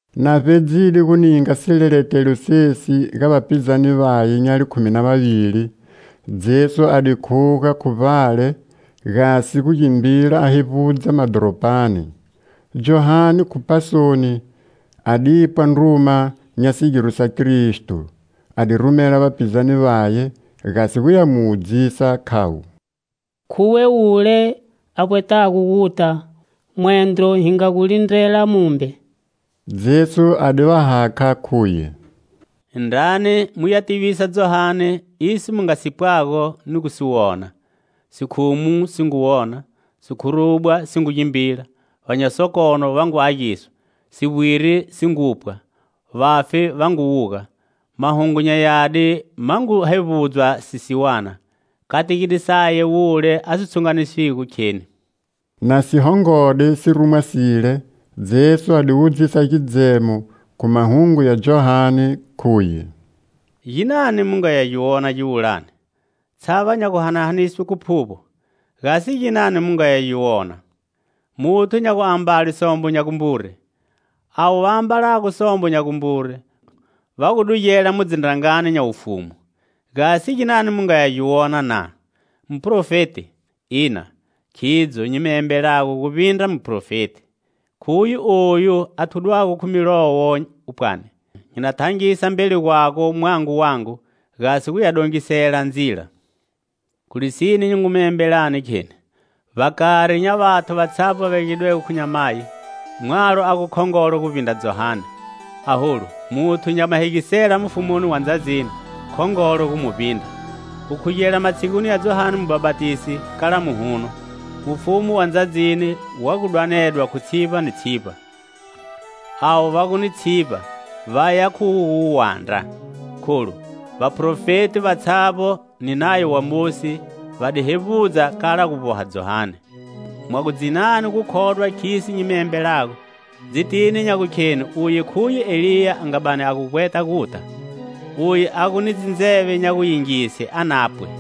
Na vbedzide gu ninga sileletelo sesi ga vapizane vaye nya likhumi na vavili, Jesu a di khuga khu vbale, gasi gu gimbila a hevbudza madhoropani. Johane, khu pasoni, adipwa ndruma nya sigiro sa Kristo. A di rumela vapizane vaye, gasi guya mu wudzisa, khavo: "Khuwe wule a vbwetago guta, mwendro hi nga gu lindrela mumbe?" Jesu a di va hakha, khuye: "Indrani muya tivisa Johane iso mu nga si pwago ni gu si wona: sikhumu si ngu wona, sikhurubwa si ngu gimbila, va nya sokono va ngu agiswa, sivbwiri si ngu pwa, vafi va ngu wuga, Mahungu nya Yadi ma ngu hevbudzwa sisiwana. Kategide saye wule a si tshunganiswigo kheni." Na si hongode sirumwa sile, Jesu a di wudzisa gidzemo khu mahungu ya Johane, khuye: "Ginani mu ngaya gi wona giwulani? Tshava nya guhanahaniswe khu phuvbo? Gasi ginani mu ngaya gi wona? Muthu nya guambale sombo nya gumbure? Avo va ambalago sombo nya gumbure va gu dugela mu dzindrangani nya wufumu. Gasi ginani mu nga ya gi wona, na? Muphrofeti? Ina. Khidzo nyi mi embelago, guvbindra ni muphrofeti. Khuye oyu a thudwago khu Milowo, pwani: 'Nyi na thangisa mbeli gwago mwango wangu, gasi guya gu dongisela ndzila.' Khu lisine nyi ngu mi embelani, kheni: vbakari nya vathu vatshavbo va velegidwego khu nyamayi, mwalo a gu khongolo guvbindra Johane. Aholu muthu nya mahegisela mufumuni wa ndzadzini khongolo gu mu vbindra. Gukhugela matshiguni ya Johane Mubhapatisi kala muhuno, Mufumu wa ndzadzini wu ngu dwanedwa khu tshivba ni tshivba. Avo va gu ni tshivba vaya gu khu gu wu wandra. Kholu vaphrofeti vatshavbo ni Nayo wa Mosi va di hevbudza kala gu vboha Johane. Mwa gu dzinani gu khodwa khiso nyi mi embelago, dzitini nya gukhenu uye khuye Eliya a nga bani a gu vbweta guta. Uye a gu ni dzindzeve nya guyingise, a na pwe.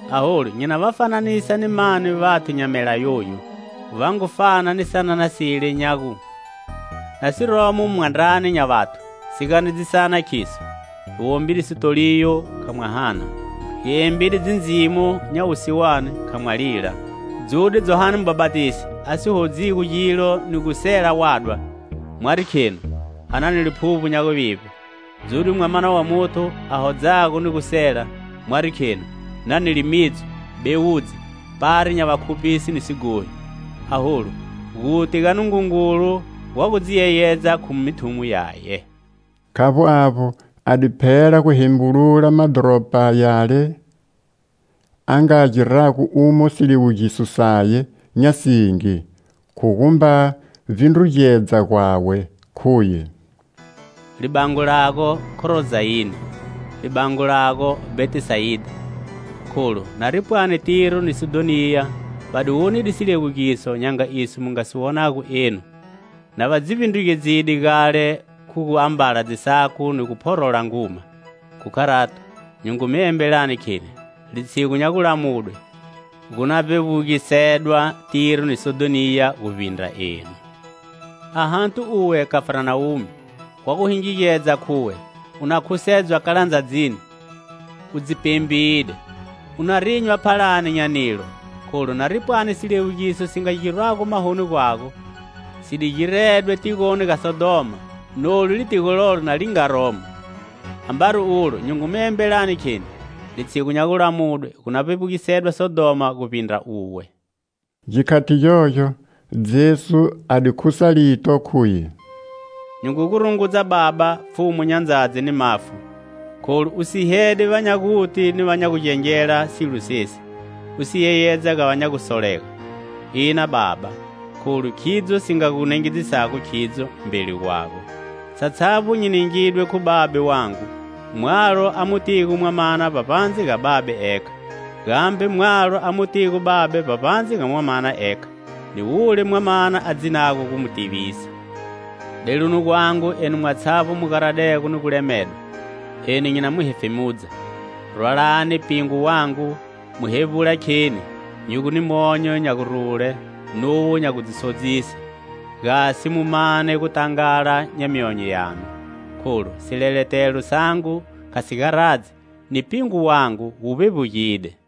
"Aholu nyi na va fananisa ni mani vathu nya mela yayu? Va ngu fana ni sanana sile nya gu, na siromo mwandrani nya vathu, si ganedzisana, khiso: 'Hi wombide sitoliyo, kha mwa hana! Hi embide dzindzimo nya wusiwane, kha mwa lila!' Dzude Johane Mubhapatisi, a si hodzigo gilo ni gu sela wadwa, mwari khenu: 'A na ni liphuvbo nya guvivbe!' Dzude Mwamana wa Muthu, a hodzago ni gu sela, mwari khenu: 'Nani limidzo, bewudzi, pari nya vakhuphisi ni sighohi!' Aholu guti ga Nungungulu gwa gu dzi yeyedza khu mithumo yaye." Khavbo avbo, a di phela gu hembulula madhoropa yale a nga girago umo siliwugiso saye nya singi, khu gumba vbindrugedza gwawe, khuye: "Libango lago, Khorozayine! Libango lago, Bhetisayida! Kholu nari pwani Tiro ni Sidhoniya va di wonide siliwugiso nya nga iso mu nga si wonago enu, na va dzi vbindrugedzile gale khu gu ambala dzisaku ni gu phorola nguma. Khu kharato, nyi ngu mi embelani, kheni: litshigu nya gulamudwe, gu na vbebugisedwa Tiro ni Sidhoniya guvbindra enu. Ahati uwe, Khafarnawume! Wa gu hingigedza khuwe u na khusedzwa kala ndzadzini? U dzi pembide! U na rinywa phalani nya nilo, kholu, nari pwani siliwugiso si nga girwago mahoni gwago si di giredwe tigoni ga Sodhoma, nolu litigo lolo na li nga romo. Ambari ulo nyi ngu mi embelani, kheni: litshigu nya gulamudwe, gu na vbevbugisedwa Sodhoma guvbindra uwe." Gikhati gyogyo, Jesu a di khusa lito, khuye: "Nyi ngu gu rungudza, Baba, Pfhumu nya ndzadzi ni mafu, kholu u sihede vanya guti ni vanya gugengela silo sesi, u si yeyedza ga va nya gusolega. Ina, Baba, kholu khidzo si nga gu nengedzisago khidzo mbeli gwago. Satshavbo nyi ningidwe khu Babe wangu. Mwalo a mu tigo Mwamana vbavbandze ga Babe ekha, gambe mwalo a mu tigo Babe vbavbandze ga Mwanaye ekha ni wule Mwamana a dzinago gu mu tivisa. Deluni gwangu, enu mwatshavbo mu garadego ni gu lemedwa; eni nyi na mu hefemudza. Rwalani pingwi wangu, mu hevbula kheni nyi gu ni monyo nya gurule nuwo nya du dzi sodzise, gasi mu mane gutangala nya myonyo yanu. Kholu sileletelo sangu kha si garadzi, ni pingwi wangu wu vbevbugide."